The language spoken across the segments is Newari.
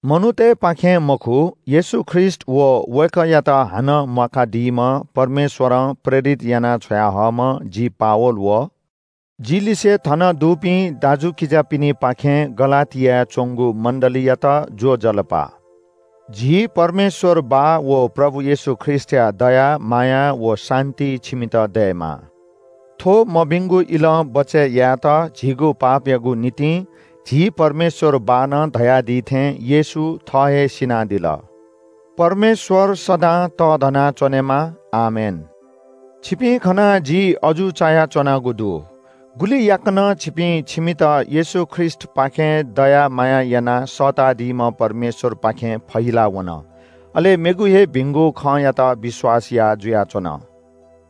मनूतय्‌पाखें मखु, येशू ख्रीष्‍ट व वय्‌कःयात हानं म्‍वाकादीम्‍ह परमेश्‍वरं प्रेरित यानाः छ्वयाहःम्‍ह जि पावल व जिलिसें थन दुपिं दाजुकिजापिनिपाखें गलातियाय् च्‍वंगु मण्‍डलीयात ज्‍वजलपा! झी परमेश्‍वर बाः व प्रभु येशू ख्रीष्‍टया दया माया व शान्‍ति छिमित दयेमा। थ्‍व मभिंगु इलं बचय् यायेत झीगु पापयागु निंतिं झी परमेश्‍वर बाःनं धयादी थें येशू थः हे सिनादिल। परमेश्‍वर सदां तःधना च्‍वनेमा! आमेन। छिपिं खनाः जि अजू चायाच्‍वनागु दु। गुलि याकनं छिपिं छिमित येशू ख्रीष्‍टपाखें दया माया यानाः सःतादीम्‍ह परमेश्‍वरपाखें फहिलावन। अले मेगु हे भिंगु खँयात विश्‍वास याः जुयाच्‍वन।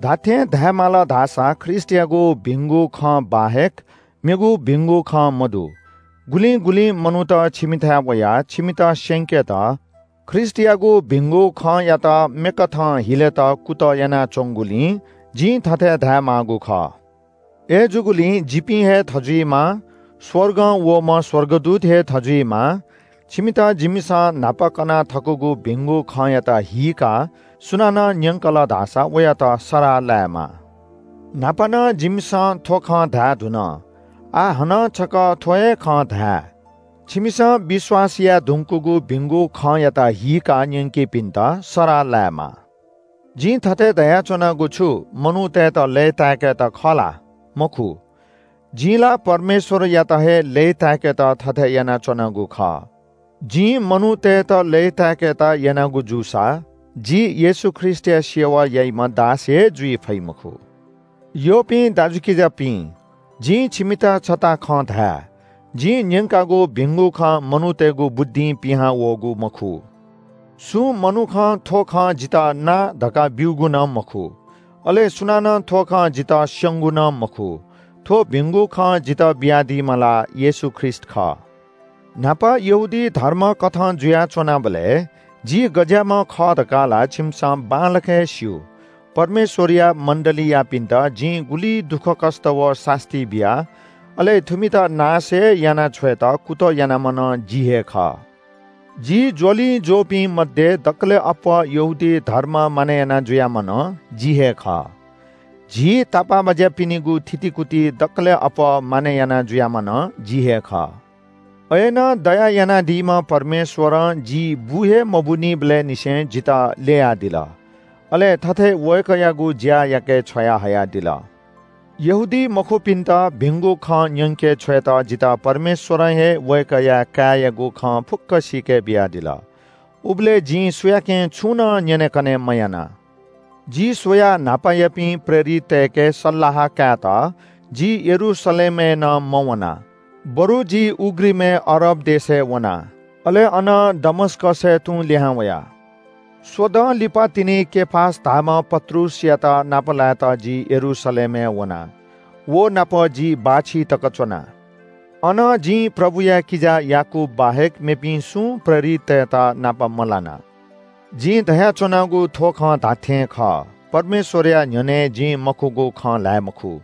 धात्‍थें धायेमाल धाःसा ख्रीष्‍टयागु भिंगु खँ बाहेक मेगु भिंगु खँ मदु। गुलिं गुलिं मनूत छिमिथाय् वयाः छिमित स्‍यंकेत ख्रीष्‍टयागु भिंगु खँयात मेकथं हिलेत कुतः यानाच्‍वंगुलिं जिं थथे धायेमाःगु खः। अय्‌जूगुलिं जिपिं हे थजुइमा, स्‍वर्गं वःम्‍ह स्‍वर्गदूत हे थजुइमा, छिमित जिमिसं न्‍हापा कना थकागु भिंगु खँयात हीकाः सुनानं न्‍यंकल धाःसा वयात सराः लायेमा। न्‍हापा नं जिमिसं थ्‍व खँ धायेधुन। आः हानं छकः थ्‍व हे खँ धाये – छिमिसं विश्‍वास याये धुंकूगु भिंगु खँयात हीकाः न्‍यंकीपिन्‍त सराः लायेमा। जिं थथे धयाच्‍वनागु छु मनूतय्‌त लय्‌ताय्‌केत खः ला? मखु! जिं ला परमेश्‍वरयात हे लय्‌ताय्‌केत थथे यानाच्‍वनागु खः। जिं मनूतय्‌त लय्‌ताय्‌केत यानागु जूसा जि येशू ख्रीष्‍टया सेवा याइम्‍ह दास हे जुइ फइ मखु। यःपिं दाजुकिजापिं, जिं छिमित छता खँ धाये – जिं न्‍यंकागु भिंगु खँ मनूतय्‌गु बुद्धिं पिहां वःगु मखु। सुं मनुखं थ्‍व खँ जितः ना धकाः ब्‍यूगु नं मखु, अले सुनानं थ्‍व खँ जितः स्‍यंगु नं मखु। थ्‍व भिंगु खँ जितः बियादीम्‍ह ला येशू ख्रीष्‍ट खः। न्‍हापा यहूदी धर्मकथं जुया च्‍वनाबलय् जि गज्‍याःम्‍ह खः धकाः ला छिमिसं बांलाक हे स्‍यू। परमेश्‍वरया मण्‍डलीयापिन्‍त जिं गुलि दुःखकष्‍ट व सास्‍ती बिया, अले थुमित नाश हे यानाछ्वयेत कुतः यानाम्‍ह नं जि हे खः। जि ज्‍वलिंज्‍वःपिं मध्‍ये दकलय् अप्‍वः यहूदी धर्म मानय् याना जुयाम्‍ह नं जि हे खः। झी तापाःबाज्‍यापिनिगु थितिकुति दकलय् अप्‍वः मानय् याना जुयाम्‍ह नं जि हे खः। अय्‌नं दया यानादीम्‍ह परमेश्‍वरं जि बु हे मबूनिबलय् निसें जितः ल्‍ययादिल। अले थथे वय्‌कःयागु ज्‍या याके छ्वयाहयादिल। यहूदीमखुपिन्‍त भिंगु खँ न्‍यंके छ्वयेत जितः परमेश्‍वरं हे वय्‌कःया काय्‌यागु खँ फुक्‍क सीके बियादिल। उबलय् जिं सुयाकें छुं नं न्‍यनेकने मयाना। जि स्‍वयाः न्‍हापायापिं प्रेरिततय्‌के सल्‍लाह कायेत जि यरूशलेमय् नं मवना। बरु जि उघ्रिमय् अरब देशय् वना। अले अनं दमस्‍कसय् तुं लिहां वया। स्‍वदँ लिपातिनि केफास धाःम्‍ह पत्रुसयात नापलायेत जि यरूशलेमय् वना, व नाप जि बाःछि तक च्‍वना। अन जिं प्रभुया किजा याकूब बाहेक मेपिं सुं प्रेरिततय्‌त नाप मलाना। जिं धयाच्‍वनागु थ्‍व खँ धात्‍थें खः। परमेश्‍वरया न्‍ह्यःने जिं मखुगु खँ ल्‍हाये मखु।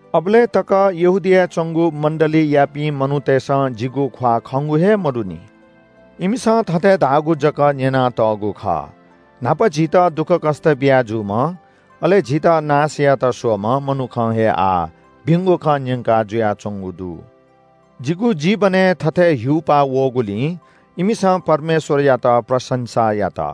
अबलय् तक यहूदियाय् च्‍वंगु मण्‍डलीयापिं मनूतय्‌सं जिगु ख्‍वाः खंगु हे मदुनि। इमिसं थथे धाःगु जक न्‍यनातःगु खः – “न्‍हापा झीत दुःखकष्‍ट बिया जूम्‍ह, अले झीत नाश यायेत स्‍वःम्‍ह मनुखं हे आः भिंगु खँ न्‍यंका जुयाच्‍वंगु दु।” जिगु जीवनय् थथे हिउपा वःगुलिं इमिसं परमेश्‍वरयात प्रशंसा यात।